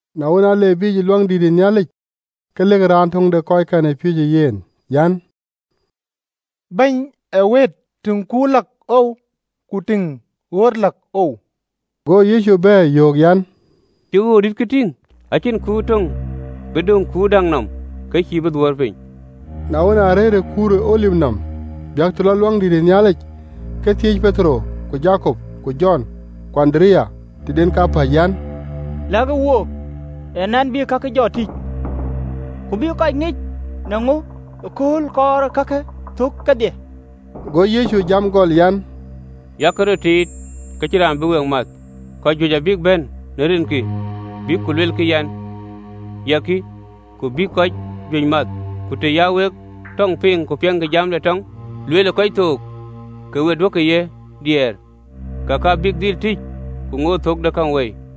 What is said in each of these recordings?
Na wën, a le biic Luaŋdït, ke lëkë raan töŋ de kɔckɛn ë piööcë yen an, “Bɛ̈ny ee wëët, tïŋ kur läk oou ku tïŋ ɣööt läk oou!” Go Yecu bɛ̈ɛ̈r, yöök an, “Cï ɣööt dïtkë tïŋ? Acïn kuur töŋ bï döŋ ë kuur däŋ nɔm, ke cïï bï dhuöör piny.” Na wën, aa rëër ë kuur ë Olip nɔm biäk të lɔ Luaŋdït, ke thiëëc ë Petero ku Jakop ku Jɔn ku Andereya tëden kapäc, An, “Lɛ̈kë wook, ee nɛn en bï kakë jɔ tïc? Ku bï kɔc ŋic në ŋö ee kööl kɔɔr ee kakë thök kedhie?” Go Yecu jam gɔl an, “Yak röt tiit ke cïn raan bï we math. Kɔc juëc abïk bɛ̈n në rinkï, bïk ku luelkï an, ‘Ya kï!’ Ku abïk kɔc juëc math. Ku të ya wek tɔɔŋ piŋ ku piɛŋkï jam ë tɔŋ lueel ë kɔc thook, ke we duökï ye diɛɛr: kek abïk dhil tïc, ku ŋoot thök de käŋ wei.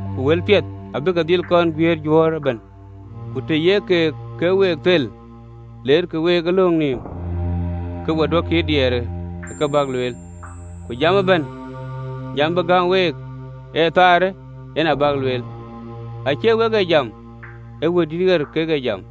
Ku wëlpiɛth abïï ke dhil kɔn guiëër juöör ëbɛ̈n. Ku të ye kek week thel, leerkï week ë löŋ nɔm, ke we duökï diɛɛr ë kë bäk lueel: ku jam ëbɛ̈n jam bï gäm week ë thaarë yen abäk lueel: acie wek bï jam, ee Wëidït ɣer kek bï jam.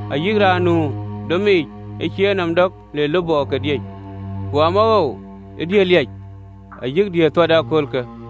ayï raan nu domic ë cïï enɔm dɔk le lupɔde diëc. Ku amawoou ë diëër liac ayï diëër thuat ë aköölkë!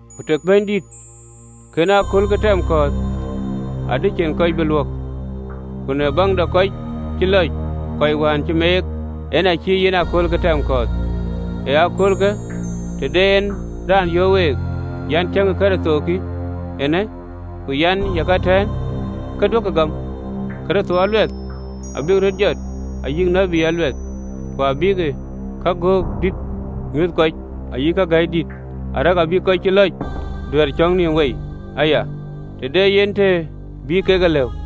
Ku tëë Bɛ̈nydït kën aköölkë tɛm kɔ̈ɔ̈th, adï cïn kɔc bï luök: ku në baŋ de kɔc cï lɔc, kɔc wään cï meek, en acï en aköölkë tɛm kɔ̈ɔ̈th. “Ë aköölkë, të de en raan yöök week an, ‘Tiëŋkï, Kërtho kï eenë!’ Ku an, ‘Ye ka ëtɛ̈ɛ̈n!’ Ke duökï gam. Kërtho aluɛth abïk röt jɔt ayï tït aluɛth, ku abïk kagöök dït nyuöth kɔc, ayï ka ke gäi dït, arëk abïk kɔc cï lɔc duɛ̈ɛ̈r cɔ̈k nïïm wei aya, të de yen të bï kek e lëu.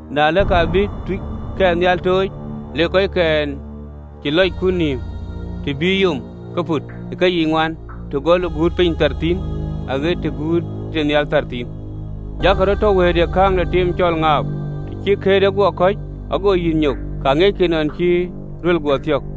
Na ëlë, ka abï tuucnhial tooc, lek kɔckɛn cï lɔc kut nïïm të ye yom pɔ̈t në aguut ke piny yiic ŋuan, gɔl ë piny thar aɣët të guutë tënhial thar thïn. Jakï röt tɔ wëëtë ë kääŋ de tim cɔl ŋaap: të cï këërde guɔ kɔ̈c, ago yïth nyok, ka ŋiɛckï nɔn cï deŋ amäi guɔ thiɔ̈k.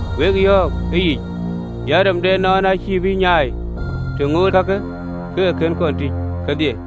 Wek yɔ̈ɔ̈k ëyic an, rem de ënɔɔnë acïï bï nyai, të ŋootë kakë ke ke kën tïc kedhie.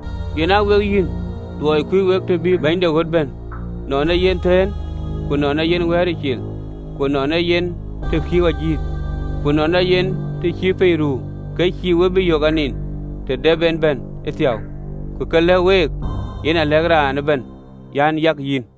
Yen aa wek yïn: luɔi kuöc wek të bï bɛ̈ny de ɣöt bɛ̈n, nɔn ee yen thëën, ku nɔn ee yen wɛ̈ɛ̈ric cil, ku nɔn ee yen të kiiu ajïth, ku nɔn ee yen të cï piny ruu, ke cïï we bï yök anin, të dɛp en bɛ̈n ëthiäu. Ku kë lɛ̈k week, yen alɛ̈k raan ëbɛ̈n, an Yak yïn!”